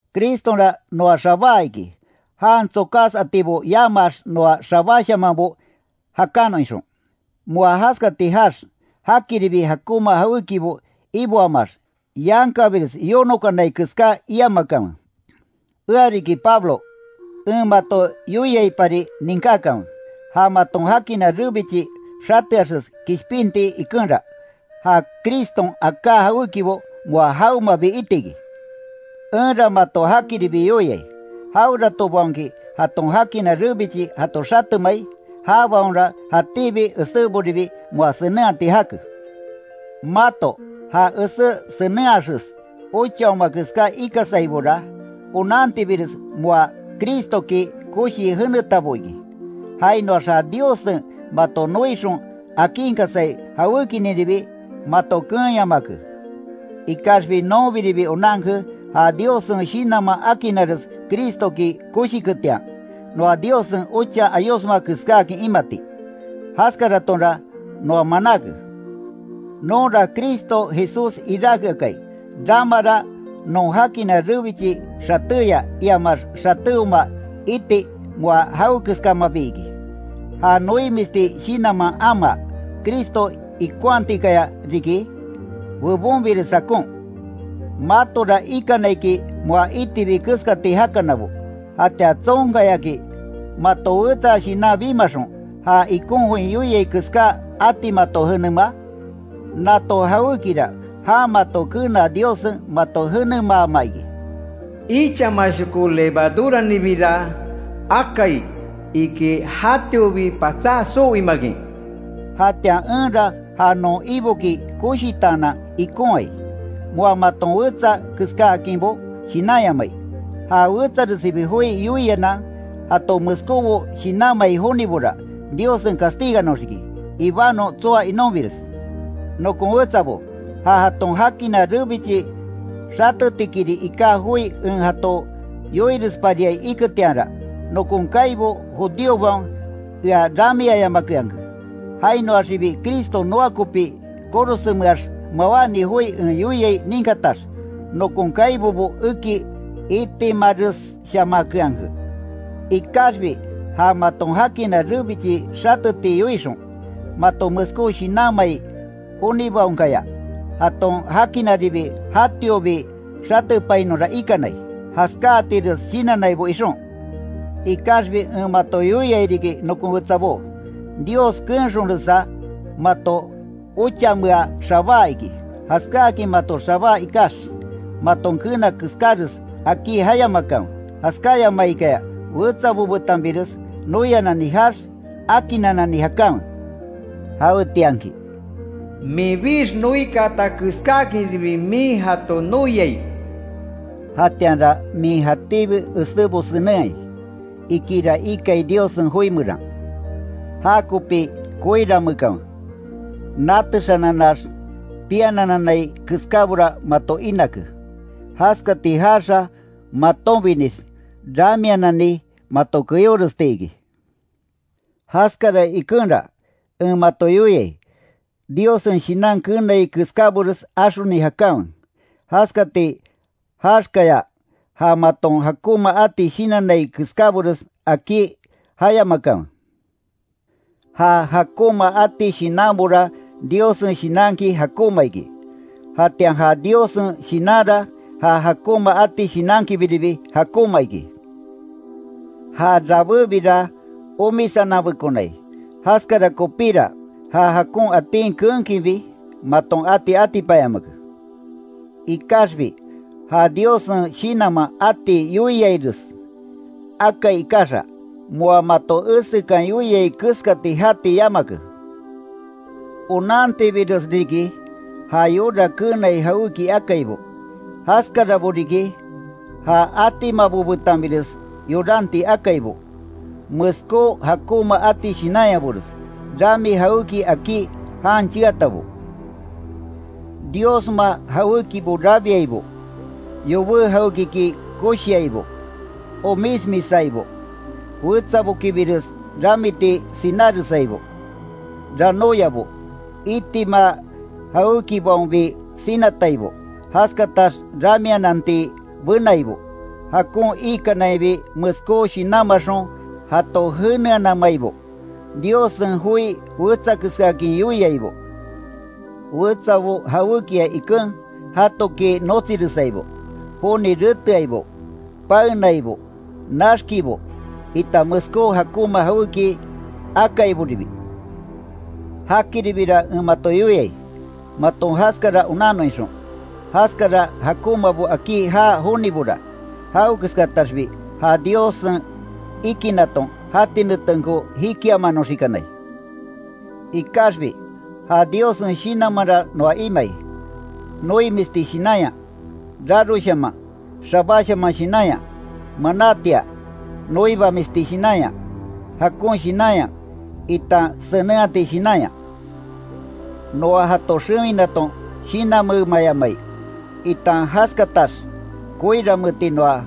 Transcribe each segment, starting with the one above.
Cristonra noa xabáa iki, jan tsokas atibo yamaax noa xabáshamanbo jakanon ixon. Moa jaskati jaax, jakiribi jakonma jawékibo iboamaax, yankabires yonokanai keská iamakanwe. Ea riki Pablo, en mato yoiaipari ninkákanwe: Ja maton jakina rebichi xateaxes kishpinti ikenra, ja Criston aká jawékibo moa jawemabi iti iki. Enra mato jakiribi yoiai, jaweratobaonki jaton jakina rebichi jato xatemai, jabaonra jatíbi eséboribi moa senenhati jake. Mato, ja esé senenhaxes ochaoma keská ikasaibora, onantibires moa Cristoki koshii jenetabo iki. Jainoax ja Diossen mato noixon akinkasai jawékininribi mato keenyamake. Ikaxbi nonbiribi onanke, ja Diossen Shinanman akinares Cristoki koshiketian, noa Diossen ocha ayosma keskáakin imati. Jaskaratonra noa manáke. Nonra Cristo Jesús iráke akai; ramara non jakina rebichi xatéya iamax xatéoma iti moa jawekeskamabi iki. Ja noimisti shinanman amaa, Cristo ikonhatikaya riki bebonbires jakon. Matora ikana iki moa itibi keskati jakanabo ¿Jatian tsonkayaki mato wetsa shinan bimaxon, ja ikon join yoiai keská ati mato jenemaa? Nato jawékira jan mato kenaa Diossen mato jenemaama iki. Ichamashoko levaduraninbira akai iki jatiobi patsá soo imakin. Jatian enra ja non Iboki koshitaanan ikonhai, moa maton wetsa keskáakinbo shinanyamai. Ja wetsaresibi joi yoianan jato meskóbo shinanmai jonibora, Diossen castiganoxiki, ibanon tsoa inonbires. Nokon wetsabo, ja jaton jakina rebichi xatetikiri iká joi en jato yoirespariai iketianra, nokon kaibo judíobaon ea ramiayamakeanke. Jainoaxibi Cristo noa kopí korosenmeax mawáni joi en yoiai ninkatax, nokon kaibobo eki itimaresshamakeanke. Ikaxbi ja maton jakina rebichi xateti yoixon, mato meskó shinanmai jonibaonkaya, jaton jakinaribi jatiobi xatepainonra ikanai, jaskáatires shinannaibo ixon. Ikaxbi en mato yoia riki nokon wetsabó, Dios keenxonresa mato ochamea xabáa iki, jaskáakin mato xabáa ikax, maton keena keskáres akí jayamakanwe. Jaskáyamaikaya wetsabo betanbires noianani jaax, akinnanani jakanwe. Jawetianki, “minbix noikaata keskákinribi min jato noiai”, jatianra min jatíbi esébo senenhai, ikira ikai Diossen joi meran. Jakopi koiranmeekanwe, natexananax, pianananai keskábora mato inake. Jaskati jaaxa, matonbinix ramianani mato keyóresti iki. Jaskara ikenra, en mato yoiai: Diossen Shinan keenai keskábores axoni jakanwe. Jaskati jaaxkaya, ja maton jakonma ati shinannai keskábores akí jayamakanwe. Ja jakonma ati shinanbora Diossen Shinanki jakonma iki. Jatian ja Diossen Shinanra ja jakonma ati shinankibiribi jakonma iki. Ja rabébira omisananbekonai. Jaskara kopíra, ja jakon atin keenkinbi maton ati atipanyamake. Ikaxbi ja Diossen Shinanman ati yoiaires akai ikaxa, moa mato esekan yoiai keskati jati yamake. Onantibires riki ja yora keenai jawéki akaibo, jaskarabo riki; ja atimabo betanbires yoranti akaibo; meskó jakonma ati shinanyabores; rami jawéki akí jan cheatabo, diosma jawékibo rabiaibo; yobé jawékiki koshiaibo; omismisaibo; wetsabokibires ramiti sináresaibo; ranóyabo; itima jawékibaonbi sinataibo; jaskatax ramiananti benaibo; jakon iikanainbi meskó shinanmaxon jato jeneanamaibo; Diossen joi wetsa keskaakin yoiaibo, wetsabo jawékia iken, jatoki notsiresaibo; joni reteaibo; paennaibo; naxkibo, itan meskó jakonma jawéki akaiboribi. Jakiribira en mato yoiai, maton jaskara onannon ixon. Jaskara jakonmabo akí jaa jonibora, jawekeskataxbi ja Diossen ikinaton jati netenko jikiamanoxikanai. Ikaxbi ja Diossen Shinanmanra noa imai; noimisti shinanya; raroshaman; xabáshaman shinanya; manátia; noibamisti shinanya; jakon shinanya, itan senenhati shinanya. Noa jato xewinaton shinanmeemayamai, itan jaskatax koiranmeeti noa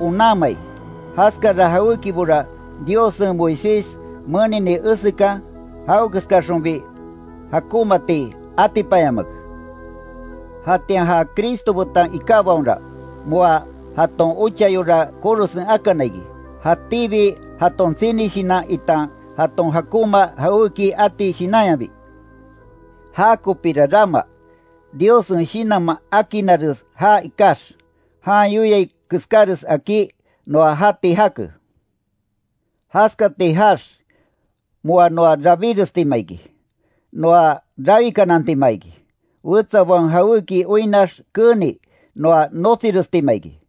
onanmai. Jaskara jawékibora Diossen Moisés menini esekan, jawekeskaxonbi jakonmaati atipanyamake. Jatian ja Cristo betan ikábaonra, moa jaton ocha yora korosen akana iki, jatíbi jaton tsini shinan itan jaton jakonma jawéki ati shinanyabi. Jakopira rama, Diossen Shinanman akinares jaa ikax, jan yoiai keskáres akí, noa jati jake. Jaskati jaax, moa noa rabírestima iki, noa rawikanantima iki, wetsabaon jawéki oinnax keeni noa notsirestima iki.